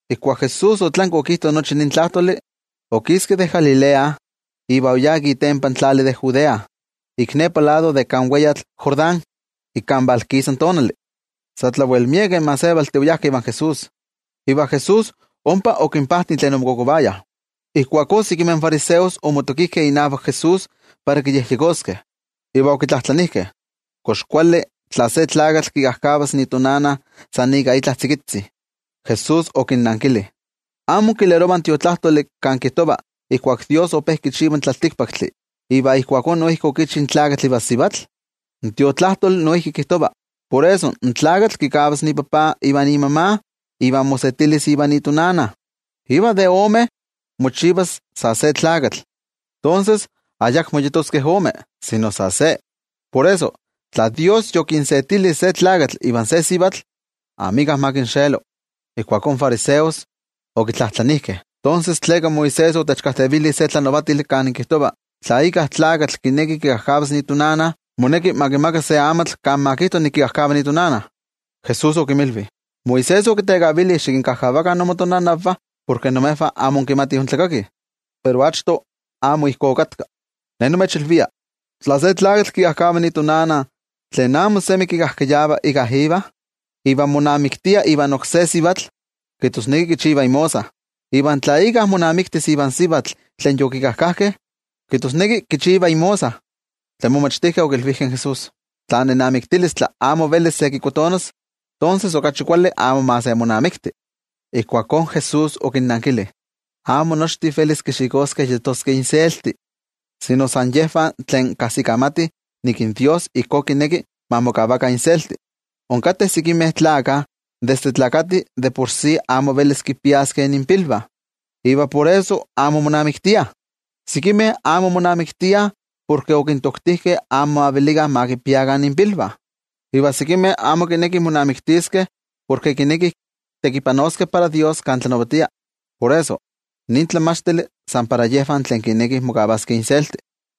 Ijkuak Jesús otlanki okijto nochi nin tlajtoli, okiski de Galilea iva oyá ik itempan tlali de Judea, ik nepa lado de kan weyatl Jordán ik kan valkisa in tonali. Sa tlawel miekeh gentejtih oyajkeh ivan Jesús. Iva Jesús ompa okinpajti tlen omokokovayah. Ijkuakó sekimeh fariseos omotokijkeh inavak Jesús para kiyejyekoskeh, iva okitlajtlanijkeh: —¿Kox kuali se tlakatl kikajkavas itonana san ika itlajtzi? Jesús okinnankili: —¿Amo inkilerovah in Tiotlajkuiloli kan kijtova ijkuak Dios ope kichiva in tlaltikpaktli, iva ijkuakó noijki okichi in tlakatl ivan sivatl? In Tiotlajkuiloli noijki kijtova: “Por eso in tlakatl kikavas ipapa ivan imama iva mosetilis ivan itonana, iva de omeh mochivas sa se tlakatl.” Tonses, ayakmo yetoskeh omeh, sino sa se. Por eso, tla Dios yokinsetili se tlakatl ivan se sivatl, amika ma kinxelo. Ijkuakó in fariseos okitlajtlanijkeh: —¿Tonses, tleka Moisés otechkajtevili se tlanavatili kan kijtova tla íkka tlakatl kineki kikajkavas itonana, moneki ma kimaka se amatl kan ma kijto nik kikajkava itonana? Jesús okinmilvi: —Moisés okitekavili xikinkajkavakah imotonanavah porke imejvah amo inkimatih intlakakih, pero achto amo ijkó okatka. Ne nimechilvia: tla se tlakatl kikajkava itonana tlen amo semi kikajkayava íkka iva, iva monamiktia ivan oksé sivatl, kijtosneki kichiva imosa. Iva tla íkka monamiktis ivan sivatl tlen yokikajkajkeh, kijtosneki kichiva imosa. Tlen momachtijkeh okilvijkeh in Jesús: —Tla nenamiktilistli amo velis se kikotonas, tonses okachi kuali amo ma se monamikti. Ijkuakó Jesús okinnankili: —Amo nochtin velis kixikoskeh yetoskeh inselti, sino san yejvah tlen kajsikamatih nik in Dios ijkó kineki ma mokavakah inselti. Onkateh sekimeh tlakah desde nesih de por sí amo velis kinpiaskeh inpilvah, iva por eso amo monamiktiah. Sekimeh amo monamiktiah porke okintoktijkeh amo ma velikah ma kinpiakah inpilvah. Iva sekimeh amo kinekih monamiktiskeh porke kinekih tekipanoskeh para Dios kan Ye tlanavatia. Por eso, nin tlamachtili san para yejvah tlen kinekih mokavaskeh inselti.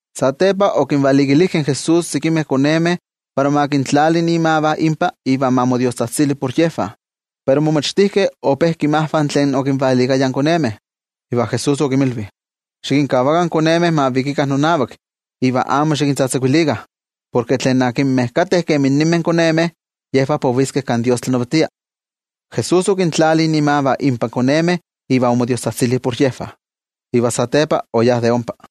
Satepa okinvalikilijkeh in Jesús sekimeh konemeh para ma kintlali imavah inpa iva ma modiostzajtzili por yejvah, pero in momachtijkeh ope kinmajvah tlen okinvalikayah in konemeh. Iva Jesús okinmilvi: —Xikinkavakah in konemeh ma vikikah nonavak iva amo xikintzatzakuilikah. Porke tlen kateh kemi ninmeh konemeh, yejvah poviskeh kan Dios tlanavatia. Jesús okintlali imavah ipan konemeh iva omodiostzajtzili por yejvah, iva satepa oyá de ompa.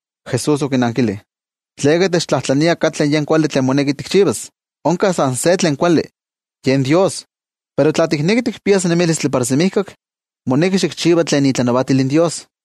Jesús okinankili: —¿Tleka techtlajtlania katlen tlamantli kuali tlen moneki tikchivas? Onka san se tlen kuali, yen Dios. Pero tla tikneki tikpias nemilistli para semijkak, moneki xikchiva tlen itlanavatil in Dios.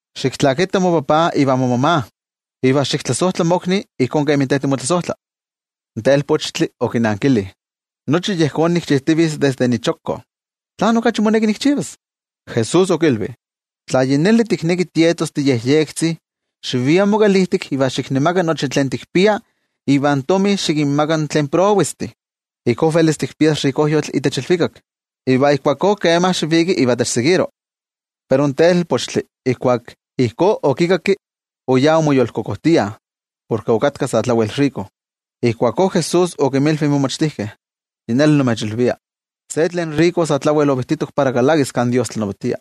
xiktlakita mopapa ivan momama, iva xiktlasojtla mokni ijkó kemi te timotlasojtla. In telpochtli okinankili: —Nochi yejón nikchijtivitz desde nichokko, ¿tlán okachi moneki nikchivas? Jesús okilvi: —Tla yi neli tikneki tietos tiyektik, xivia mokalijtik iva xiknemaka nochi tlen tikpia iva in tomi xikinmaka tlen prowestih. Ijkó velis tikpias rikojyotl itech ilvikak. Iva ijkuakó kema xiviki iva techseguiro. Pero in telpochtli ijkuak ijkó okikakki, oyá omoyolkokojtia, porke okatka sa tlawel tomine. Ijkuakó Jesús okinmilvi in momachtijkeh: —Yi neli nimechilvia, se tlen tomine sa tlawel ovijtitok para kalakis kan Dios tlanavatia.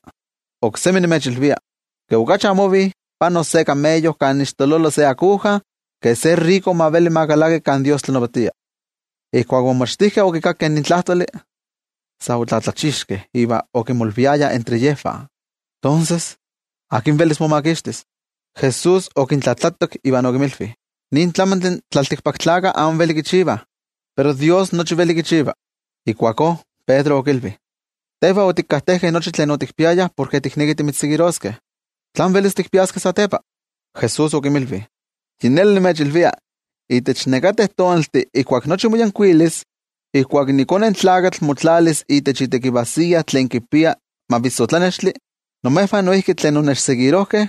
Oksemi nimechilvia, ke okachi amo ovi panos se kameyo kan ixtololo se aguja, ke se tomine ma veli ma kalaki kan Dios tlanavatia. Ijkuak in momachtijkeh okikakkeh nin tlajtoli, sa otlatlachixkeh iva okimolviayah entre yejvah: —Tonses, ¿akin velis momakixtis? Jesús okintlajtlatak iva okinmilvi: —Nin tlamantli in tlaltikpaktlakah amo veli kichivah, pero Dios nochi veli kichiva. Ijkuakó Pedro okilvi: —Tejvah otikajtejkeh nochi tlen otikpiayah porke tiknekih timitzseguiroskeh. ¿Tlán velis tikpiaskeh satepa? Jesús okinmilvi: —Yi neli nimechilvia, itech nekateh tonaltih ijkuak nochi moyankuilis, ijkuak iKone in Tlakatl motlalis itech itekivajsiya tlen kipia mavissotlanextli, imejvah tlen onnechseguirojkeh,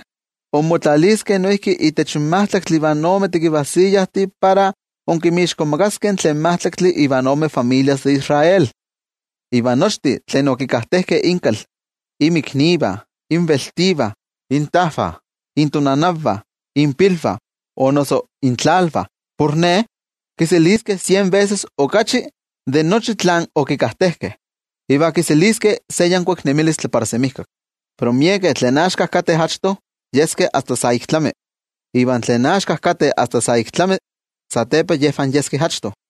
inmotlaliskeh noijki itech majtlaktli ivan ome tekivajsiyajtih para inkinmixkomakaskeh tlen majtlaktli ivan ome familias de Israel. Iva nochtin tlen okikajtejkeh inkal, inmiknivah, inveltivah, intajvah, intonanavah, inpilvah o noso intlalvah por Ne, kiseliskeh sien veses okachi de nochi tlen okikajtejkeh, iva kiseliskeh se yankuik nemilistli para semijkak. Pero miekeh tlen axka kateh achto satepa yeskeh asta sa ik tlami, iva tlen axka kateh asta sa ik tlami satepa yejvah yeskeh achto.